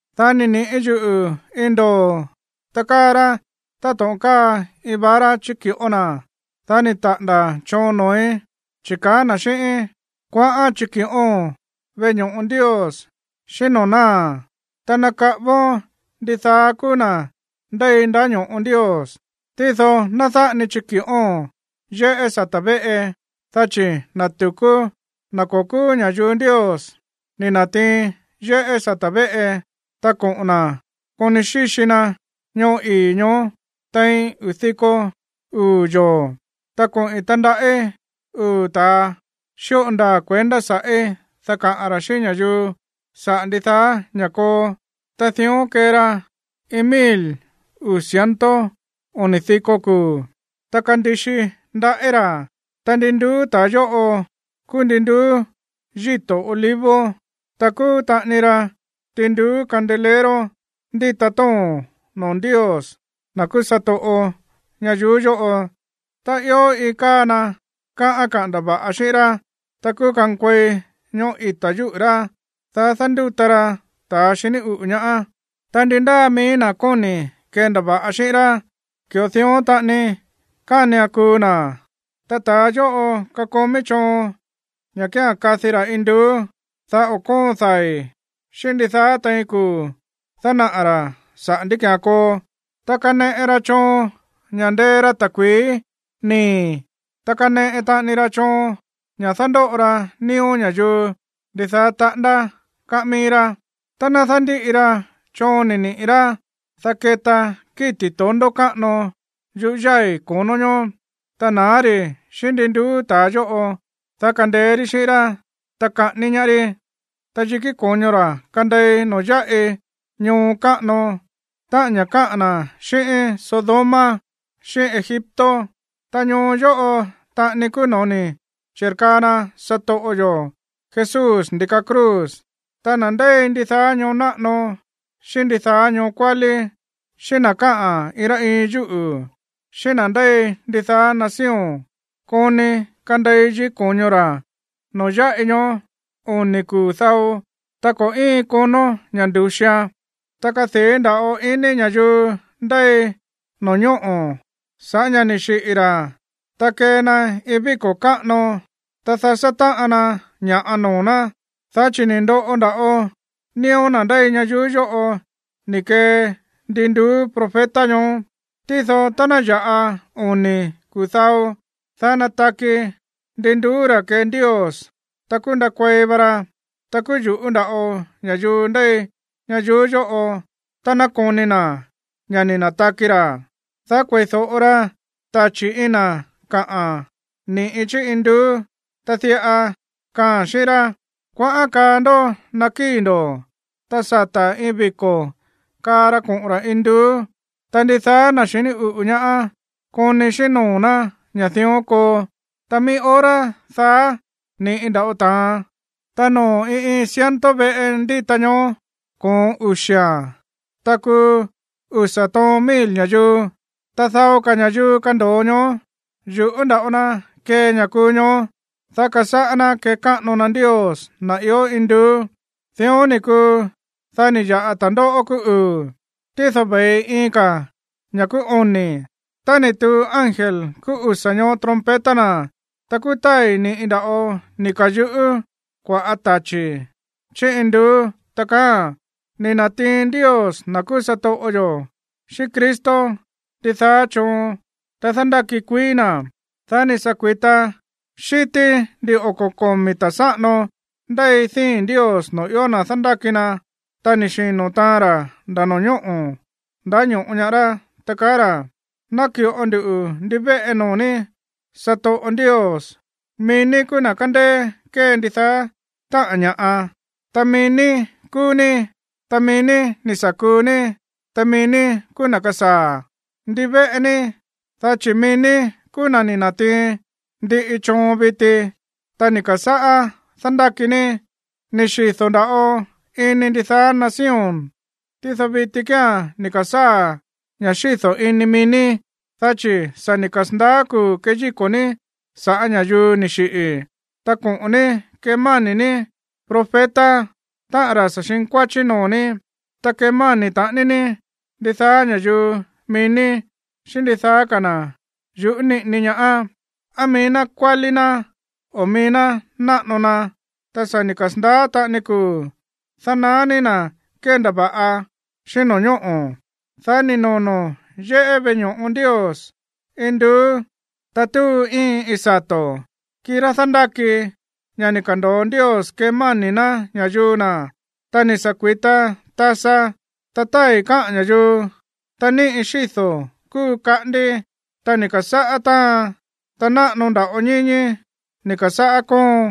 Dá ni̱ niꞌi̱ yuꞌu̱ iin ndoo̱, ta káa rá táto̱ꞌon káa iin vara chíki̱ꞌó na̱. Dá ni̱ taꞌa̱nda̱ choon noo̱í, chi̱ kaá na̱ xíꞌíín: ―Kuaꞌán chiki̱ꞌóo̱n veꞌe ño̱ꞌo Ndios, xíꞌín noo̱ náa̱, ta nakaꞌávón ndidaá kúú na̱ ndéi ndáño̱ꞌo Ndios. Tído ná dáꞌa ni chiki̱ꞌóo̱n yéꞌé sata̱ véꞌe, dá chi̱ na̱ tu̱kú, na̱ ko̱ kúú ña̱yuu Ndios, ni̱ na̱tiin yéꞌé sata̱ véꞌe, ta koꞌo̱n na̱ koni xíxi na ñoo ii̱ ñoó tein uu̱ diko uu̱ yoo̱. Ta koꞌi̱n tandaꞌí uu̱ ta̱a xíꞌo ndaa̱ kuendá sa̱ꞌí, dá kaꞌa̱n ra̱ xíꞌín ña̱yuu saꞌa̱ ndidaá ña̱ koo. Ta dión kee ra iin mil uu̱ ciento oni̱ diko kuu̱, ta kandixi ndaꞌí ra̱. Ta ndin nduú ta̱a yóꞌo kúú ndin nduú yíto̱ olivo, ta kúú taꞌani ra ndin nduú candelero ndíta tóo̱n noo̱ Ndios, na̱ kúú satoꞌo ñayuú yóꞌo. Tá ió iin káa na kaꞌán kendava̱ꞌa xíꞌín rá, ta kúú kankuei ñoꞌó ita̱ yúꞌu̱ rá, dá dándúta ra ta̱a xiní uꞌu̱ ñaá. Ta ndi ndáa mií na̱ kóni̱ kendava̱ꞌa xíꞌín rá, ki̱ꞌo dión taꞌani kánian kuu na̱. Ta ta̱a yóꞌo kakomí choon ña̱ kía̱n kadi ra̱ induú, dá o̱ kóon dai̱ xíꞌín ndidaá tein kuu̱ dánaꞌa̱ ra̱ saꞌa̱ ndí ki̱án koo. Ta kaneꞌe ra choon ña̱ ndee ra ta̱kui̱í nii̱, ta kaneꞌe taꞌani ra choon ña̱ dándóꞌo ra nío̱ ña̱yuu ndidaá taꞌándá káꞌán mií rá. Tá ná dándíꞌi ra choon ni̱ niꞌi̱ rá, dá keta kíti̱ tondó káꞌano yuꞌú yái̱ ko̱nó ñoó, ta na̱á ri̱ xíꞌín ndin nduú ta̱a yóꞌo, dá kandeé rí xíꞌín rá, ta kaꞌání ñaá rí. Ta yikí ko̱ño ra̱ kandei noo̱ yáꞌi ñoo káꞌano, táꞌa̱n ña̱ káꞌa̱n na̱ xíꞌín Sodoma xíꞌín Egipto. Ta ñoo yóꞌo taꞌani kúú no̱ó ni̱ chi̱rkaa na satoꞌo yo̱ Jesús ndi̱ka cruz. Ta na̱ ndéi ndidaá ñoo náꞌano xíꞌín ndidaá ñoo kuálí, xíꞌín na̱ káꞌa̱n iin rá iin yúꞌu̱, xíꞌín na̱ ndéi ndidaá nación koni kandei yikí ko̱ño ra̱ noo̱ yáꞌi ñoó oni̱ kuu̱ dao, ta ko̱ íin konó ña̱ ndu̱xian. Ta kadii̱ nda̱ꞌo ini ña̱yuu ndéi no̱ñóꞌo̱ sa̱ꞌá ña̱ ni̱ xiꞌi̱ ra̱, ta kee na iin víko̱ káꞌano, ta dasá táꞌan na ña̱ꞌa noo̱ ná, dá chi̱ ni̱ ndoꞌo nda̱ꞌo nío̱ na̱ ndéi ñayuú yóꞌo ni̱ kee ndin nduú profeta ñoó. Tído tá ná ya̱ꞌa oni̱ kuu̱ dao, dá nataki ndin nduú ra̱ kee Ndios, ta kúú ndakuei va ra. Ta kúú yu̱ꞌú nda̱ꞌo ña̱yuu ndéi ñayuú yóꞌo tá ná koni na̱ ña̱ ni̱ na̱taki ra̱. Dá kueídóꞌo ra tachi̱ iin na̱ kaꞌa̱n ni̱ꞌi chí induú, ta diꞌa kaaa̱n xíꞌín rá: ―Kuaꞌán kaa ndó naꞌa kíi̱ ndo̱. Ta sata̱ iin viko̱ kaa ra koꞌo̱n ra̱ induú, ta ndidaá na̱ xiní uꞌu̱ ñaá koni xíꞌín noo̱ ná ña̱ dión koo. Ta mií hora daá ni̱ꞌi nda̱ꞌo ta̱an, ta noo̱ iin iin ciento veꞌe ndíta ñoó, koon uxi̱a̱n, ta kuu usa̱ toon mil ña̱yuu. Ta dao ka̱ ña̱yuu kando̱o ñoó, yu̱ꞌú nda̱ꞌo na kee ña̱ kuu ñoó, dá kasáꞌá ná kekáꞌano na Ndios, na̱ ió induú. Dión ni̱ kuu, dá ni̱ ya̱ꞌa ta̱ndóꞌó kúú uu̱, tído ve̱i iin ka̱a̱n, ña̱ kúú oni̱. Tá ni̱ tuu ángel kúú usa̱ ñoó trompeta na̱, ta kúú tái̱ ni̱ꞌi nda̱ꞌo ni̱ ka̱yuꞌú kua̱ꞌá tachi̱ chí induú, ta kaáa̱n: Ni̱ na̱tiin Ndios, na̱ kúú satoꞌo yo̱, xíꞌín Cristo ndidaá choon, ta dándáki kuií na̱. Dá ni̱ sa̱ kui̱ta xi̱tí ndin oko̱ komi̱ ta̱ sáꞌano ndéi díi̱n Ndios noo̱ ió na̱ dándáki na, ta ni̱ xino̱ taan ra̱ nda̱ no̱ñóꞌo̱ ndáño̱ꞌo ñaá rá, ta kaá ra̱: Náki̱ꞌo ndu ndivéꞌe noo̱ ní, satoꞌo Ndios, mií ní kúú na̱ kándéé kée ndidaá táꞌa̱n ña̱ꞌa, ta mií ní kúú ní, ta mií ní ni̱ sa̱ kuu ní, ta mií ní kúú na̱ kasaa̱. Ndivéꞌe ní, dá chi̱ mií ní kúú na̱ ni̱ na̱tiin ndiꞌi choon viti, ta ni̱ ka̱sáꞌá dándáki ní. Ni̱ xido̱ nda̱ꞌo ini ndidaá nación, tído viti kía̱n ni̱ ka̱sáa̱ ña̱ xído̱ ini mií ní, dá chi̱ sa̱ ni̱ kasa̱ndaá kuu̱ keyíko̱ ní sa̱ꞌá ña̱yuu ni̱ xiꞌi̱. Ta koꞌo̱n ní kemáni̱ ní profeta, táꞌa̱n na̱ sa̱ xinkuáchí noo̱ ní, ta kemáni̱ taꞌani ní ndidaá ña̱yuu mií ní, xíꞌín ndidaá ka̱ na̱ yu̱ꞌú niꞌini ñaá, á mií ná kuálí ná o á mií ná náꞌano na. Ta sa̱ ni̱ kasa̱ndaá taꞌani kuu̱ dánaá ní na̱ kéndava̱ꞌa xíꞌín no̱ñóꞌo̱. Dá ni̱ nono̱ yéꞌé veꞌe ño̱ꞌo Ndios induú, ta túu íin iin sato̱, kirá dándáki ña̱ ni̱ ka̱ndo̱o Ndios kemáni̱ ná ña̱yuu na̱. Ta ni̱ sa̱ kui̱ta tasa, ta tái̱ káꞌa̱n ña̱yuu, ta níꞌi xído̱ kúu kaꞌandi, ta ni̱ ka̱sáꞌá táan, ta náꞌano nda̱ꞌo ñíñí ni̱ ka̱sáꞌá kóon.